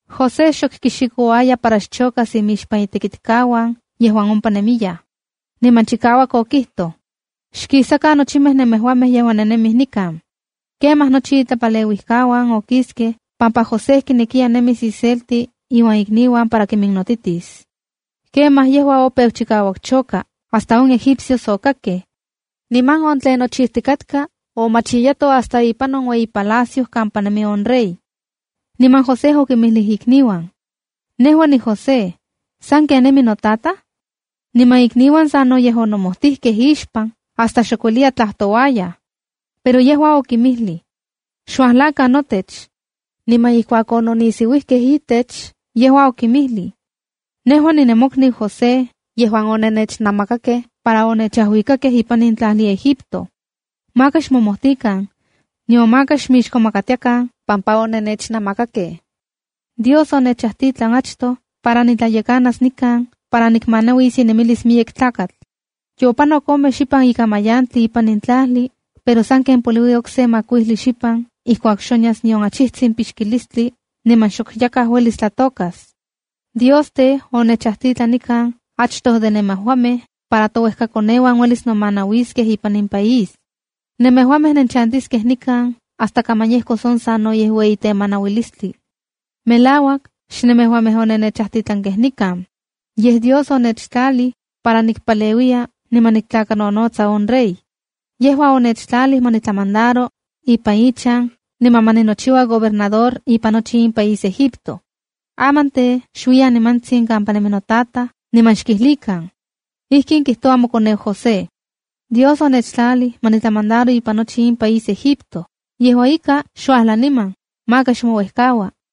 José xok kixikouaya para xchokas imixpan itekitkauan yejuan ompa nemiyaj. Niman chikauak okijtoj: “¡Xkisakan nochimej nemejuamej yejuan nennemij nikan!” Kemaj nochi itlapaleuijkauan okiskej pampa José kinekiya nemis iselti iuan ikniuan para kiminnotitis. Kemaj yejua opeu chikauak choka hasta on egipcios okakkej. Niman on tlen nochijtikatka omachiyato hasta ipan on ueyi palacio kampa nemi on rey. Niman José okinmijlij ikniuan: —Nejua niJosé. ¿Sanken nemi notataj? Niman ikniuan sanoyej onomojtijkej ixpan hasta xok ueliyaj tlajtouayaj. Pero yejua okinmijlij: —Xuajlakan notech. Niman ijkuak ononisiuijkej itech, yejua okinmijlij: —Nejua nemokniu José yejuan onennechnamakakej para onechajuikakej ipan in tlajli Egipto. Maka xmomojtikan, nion maka xmixkomakatiakan pampa onennechnamakakej. Dios onechajtitlan achtoj para nitlayekanas nikan para nikinmanauis inemilis miyek tlakatl. Yopanok ome xipan ikan mayantli ipan in tlajli, pero sanken poliui okse makuijli xipan ijkuak xonyas nion achijtsin pixkistli niman xok yakaj uelis tlatokas. Dios tej, onechajtitlan nikan achtoj de nemejuamej para touejkakoneuan uelis nomanauiskej ipan in país. Nemejuamej nenchantiskej nikan hasta kaman yejkos on sanoyej ueyi temanauilistli. Melauak xnemejuamej onennechajtitlankej nikan. Yej Dios onechtlalij para nikpaleuiya niman niktlakanonotsa on rey. Yejua onechtlalij ma nitlamandaro ipan ichan, niman ma ninochiua gobernador ipan nochi in país Egipto. Aman tej, xuiyan nimantsin kampa nemi notataj, niman xkijlikan: “Ijkin kijtoua mokoneu José: ‘Dios onechtlalij ma nitlamandaro ipan nochi in país Egipto. Yejua ika, xuajla niman. Maka xmouejkaua.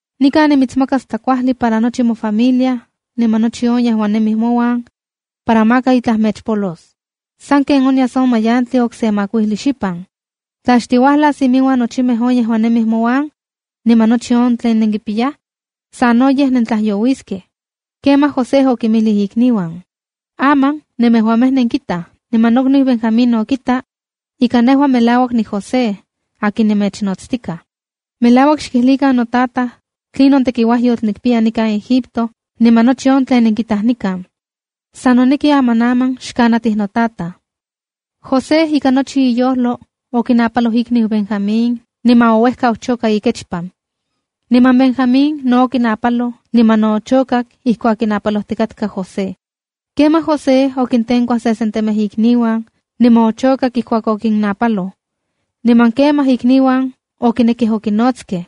Nikan nimitsmakas tlakuajli para nochi mofamilia niman nochi yejuan nemij mouan para maka itlaj mechpolos. Sanken onyas in mayantli okse makuili xipan. Tla xtiuajlas iminuan nochimej on yejuan nemij mouan niman nochi on tlen nenkipiyaj, sanoyej nentlajyouiskej.’” Kemaj José okinmijlij ikniuan: —Aman nemejuamej nenkitaj niman nokniu Benjamín no kita, ika nejua melauak niJosé akin nemechnotstika. Melauak xkijlikan notataj tlinon tekiuajyotl nikpiya nikan Egipto, niman nochi on tlen nenkitaj nikan. San noneki amanaman xkanatij notataj. José ika nochi iyojlo okinapaloj ikniu Benjamín, niman ouejkau choka ikechpan. Niman Benjamín no okinapaloj, niman ochokak ijkuak kinapalojtikatka José. Kemaj José okintenkuaj sesentemej ikniuan niman ochokak ijkuak okinnajnapaloj. Niman kemaj ikniuan okinekej okinojnotskej.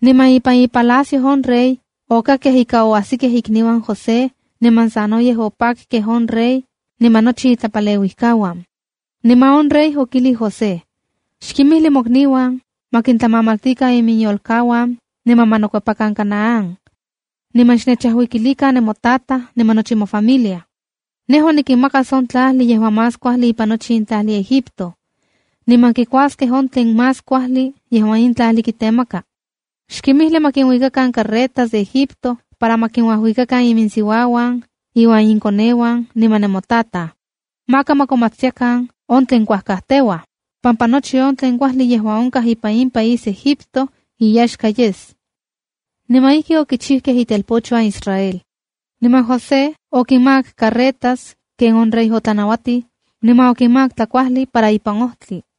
Niman ipan ipalacio on rey, okakkej ika oajsikej ikniuan José niman sanoyej opakkej on rey niman nochi itlapaleuijkauan. Niman on rey okijlij José: —Xkinmijli mokniuan ma kintlamamaltikan iminyolkauan niman ma nokuepakan Canaán, niman xnechajuikilikan nemotataj niman nochi ifamilia. Nejua nikinmakas on tlajli yejuan más kuajli ipan nochi in tlajli Egipto. Niman kikuaskej on tlen más kuajli yejuan in tlajli kitemaka. Xkimijli ma kinuikakan carretas de Egipto para ma kinuajuikakan iminsiuauan iuan inkoneuan niman nemotataj. Maka ma komatstiakan on tlen kuajkajteuaj, pampa nochi on tlen kuajli yejuan onkaj ipan in país Egipto inyaxka yes. Niman ijki okichijkej itelpochuan Israel. Niman José okinmakak carretas ken on rey otlanauatij, niman okinmakak tlakuajli para ipan ojtli.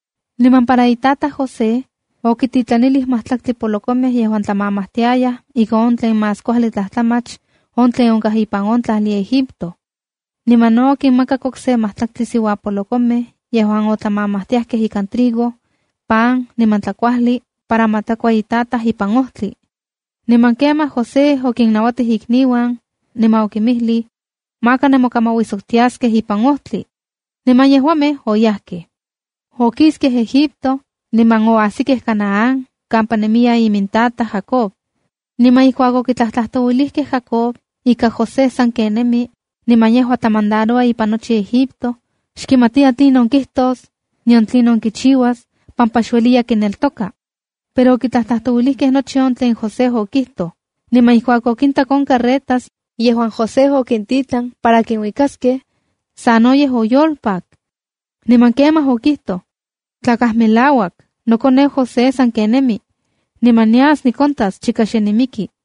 Niman para itataj José, okititlanilij majtlaktli polokomej yejuan otlamamajtiajkej ika on tlen más kuajli tlajtlamach on tlen onkaj ipan on tlajli Egipto. Niman no okinmakak okse majtlaktli siuapolokomej yejuan otlamamajtiajkej ikan trigo, pan niman tlakuajli para ma tlakua itataj ipan ojtli. Niman kemaj José okinnajnauatij ikniuan, niman okinmijlij: —Maka nemokamauijsoktiaskej ipan ojtli. Niman yejuamej oyajkej. Okiskej Egipto niman oajsikej Canaán kampa nemiya imintataj Jacob. Niman ijkuak okitlajtlajtouilijkej Jacob ika José saken nemi niman yejua tlamandaroua ipan nochi Egipto, xkimatiya tlinon kijtos, nion tlinon kichiuas, pampa xueliya kineltoka. Pero okitlajtlajtouilijkej nochi on tlen José okijtoj, niman ijkuak okintak on carretas yejuan José okintitlan para kinuikaskej, sanoyej oyolpak. Niman kemaj okijtoj: “Tlakaj melauak, nokoneu José sanken nemi, niman nias nikontas chika xe nimiki.”